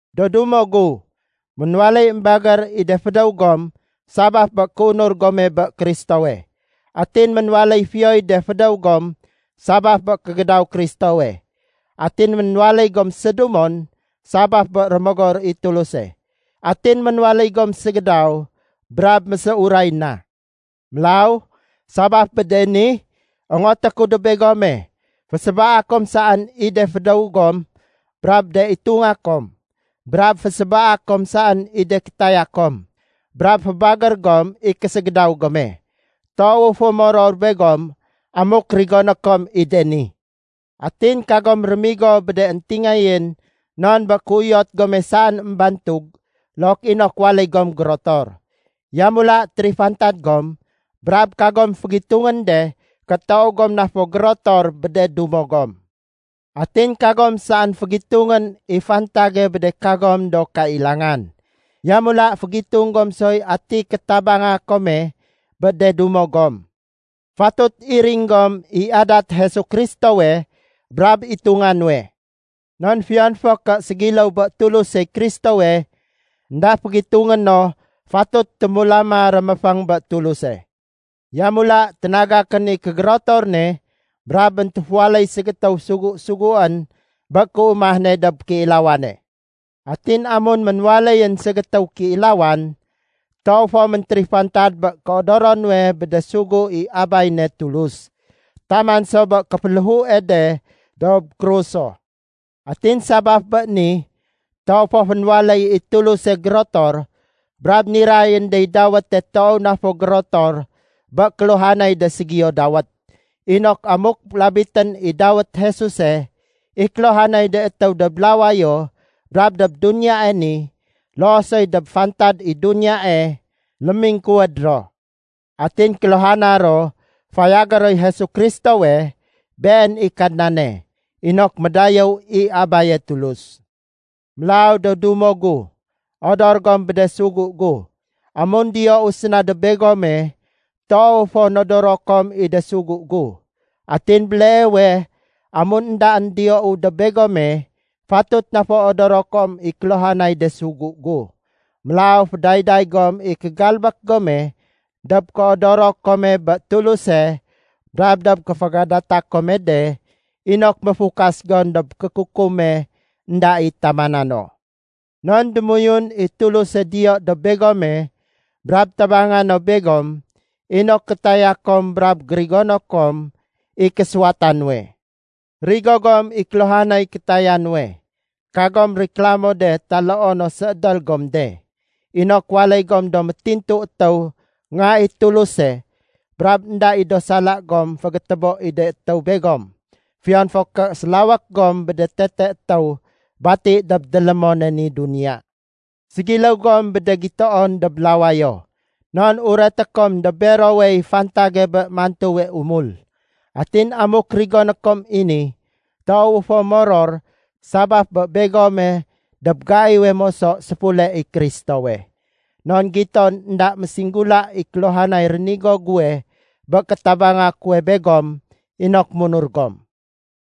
Do dumo gu, ménwaléy émbagér i de fédéw gom sabaf bé kéunur gome bé Kristowe. Atin ménwaléy fiyoy de fédéw gom sabaf bé kégédaw Kristowe. Atin ménwaléy gom sédumon sabaf bé Rémogor i Tuluse. Atin ménwaléy gom ségédaw brab méséuray na. Mélaw, sabaf bé de ni, ongoté ku dob begome, fésébaa kom saén i de fédéw gom brab de itunga kom, brab fésébaa kom saén i de kétaya kom, brab fébagér gom i késégédaw gome. Toowu fo moror begom amuk rigoné kom i de ni. Atin kagom rémigo bé de éntingayén non bé kéuyot gome saén émbantug look inok waléy gom gérotor. Yamula térifantad gom brab kagom fégitungén de ké toow gom na fo gérotor bé de dumo gom. Atin kagom saén fégitungén i fantage bé de kagom do kailangan. Yamula fégitung gom soy ati kétabanga kome bé de dumo gom. Fatut iring gom i adat Jesu Kristowe brab itunga nuwe. Non fiyon fo ké ségiléw bé Tulusey Kristowe, énda fégitungé no fatut témulama réméféng bé Tuluse. Yamula ténagakén i kégérotor ne brab méntéféwaléy ségétéw sugu-suguén bé kéumah ne dob kéilawane. Atin amun ménwaléyén ségétéw kéilawan, toow fo méntérifantad bé kéodoro nuwe bé de sugu i Abay ne Tulus taman so bé kéféléhue de dob kruso. Atin sabaf bé ni, toow fo fénwaléy i Tuluse gérotor brab nirayén dey dawéte toow na fo gérotor bé kéluhanay de ségiyo dawét, inok amuk labitén i dawét Jesuse, i kéluhanay de étéw dob lawayo, brab dob duniyae ni, loo soy dob fantad i duniyae, lémingkuwéd ro. Atin kéluhana ro fayagé roy Jesu Kristowe, Been i Kadnane, inok médayéw i Abaye Tulus. Mélaw do dumo gu, odor gom bé de sugu gu. Amun diyou séna dob begome, toow fo nodoro kom i de sugu gu. Atin béleewe amun éndaén diyou dob begome, fatut na fo odoro kom i kéluhanay de sugu gu. Mélaw fédayday gom i kégalbék gome dob kéodoro kome bé Tuluse brab dob kéfégadata kome de inok méfukas gom dob kékukume énda i tamana no. Non démoyun i Tuluse diyo dob begome brab tabanga no begom inok kétaya kom brab gérigono kom i késuwata nuwe. Rigo gom i kéluhanay kétaya nuwe, kagom riklamo de taloo no séédél gom de, inok waléy gom do métintu étéw nga i Tuluse brab énda i do sala gom fégétébo i de étéw begom fiyon fo ké sélawék gom bé de tete étéw bati dob délémone ni duniya. Ségiléw gom bé de gitoon dob lawayo, non ureté kom dob berowey fantage bé mantuwe umul. Atin amuk rigoné kom i ni, toowu fo moror sabaf bé begome dob gaiwe moso séfule i Kristowe. Non giton énda ménsinggula i kéluhanay rénigo guwe bé kétabang guwe begom inok munur gom.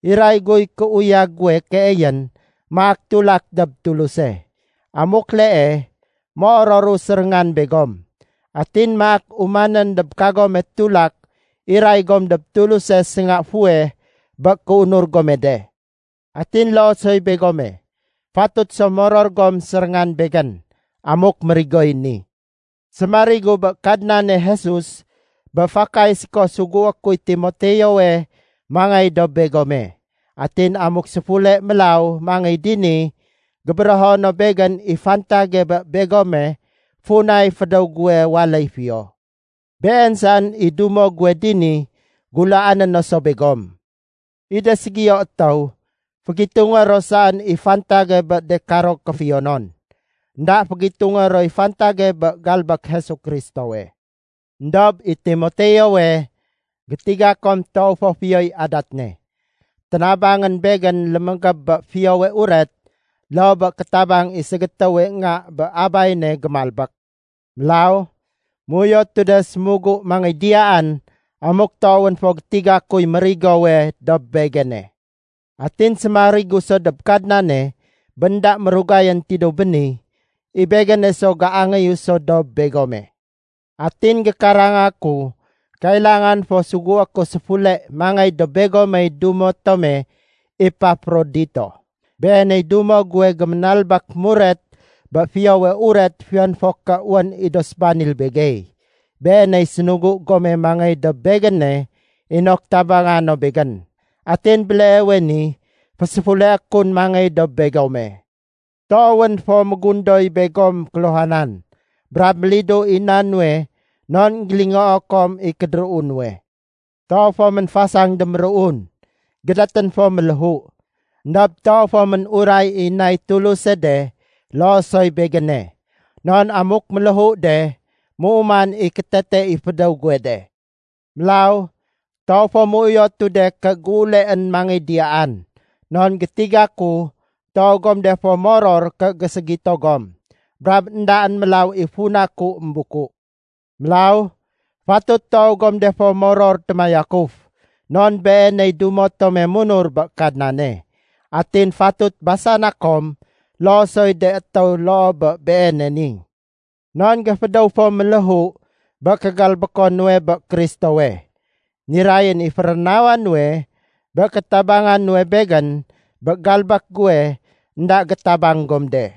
Iray guy kéuyag guwe keeyén maak tulak dob Tuluse. Amuk lee, méororu séréngan begom, atin maak umanén dob kagome tulak iray gom dob Tuluse sénga fuweh bé kéunur gome de. Atin loo soy begome, fatut so moror gom séréngan begén amuk mérigoy ni. Sémarigu bé Kadnane Jesus bé fakay séko sugué kuy Timoteowe mangéy dob begome. Atin amuk séfule mélaw mangéy dini, gébérého no begén i fantage bé begome funay fédéw guwe waléy fiyo. Been saén i dumo guwe dini gulaané no so begom. I de ségiyo étéw, fégitungé ro saén i fantage bé de karo kéfiyonon. Enda fégitungé roy fantage bé galbék Jesu Kristowe. Endob i Timoteowe, gétiga kom toow fo fiyoy adat ne. Ténabangén begén lémégéb bé Fiyowe Uret loo bé kétabang i ségétéwe nga bé abay ne gémalbék. Mélaw, méuyotu de sémugu mangéy diyaan amuk toowén fo gétiga kuy mérigowe dob begéne. Atin sémarigu so dob Kadnane bé énda mérugayén tidéw béni, i begéne so géangéyu so dob begome. Atin gékaranga ku kailangan fo sugué ku séfule mangéy dob begomey dumo tome Epafrodito. Beeney dumo guwe géménalbék muret bé Fiyowe Uret fiyon fo ké wén i do sébanil begey. Beeney sénugu gome mangéy dob begéne inok tabanga no begén, atin béleewe ni féséfuleé kun mangéy dob begome. Toowén fo mégundoy begom kéluhanan brab mélidu i na nuwe non énggélingoo kom i kédéruu nuwe. Toow fo ménfasang déméruun, gédétén fo méléhu. Endob toow fo ménuray i nay Tuluse de loo soy begéne. Non amuk ménléhu de, méuman i kétete i fédéw guwe de. Mélaw toow fo méuyotu de ké géuleén mangéy diyaan non gétiga ku toow gom de fo moror ké géségito gom, brab éndaén mélaw i funa ku émbuku. Mélaw fatut toow gom de fo moror témayakuf non beeney dumo tome munur bé Kadnane. Atin fatut basana kom loo soy de étéw loo bé beene ni. Non géfédéw fo méléhu bé kégalbéko nuwe bé Kristowe. Nirayén i férénawa nuwe bé kétabanga nuwe begén bé galbék guwe énda gétabang gom de.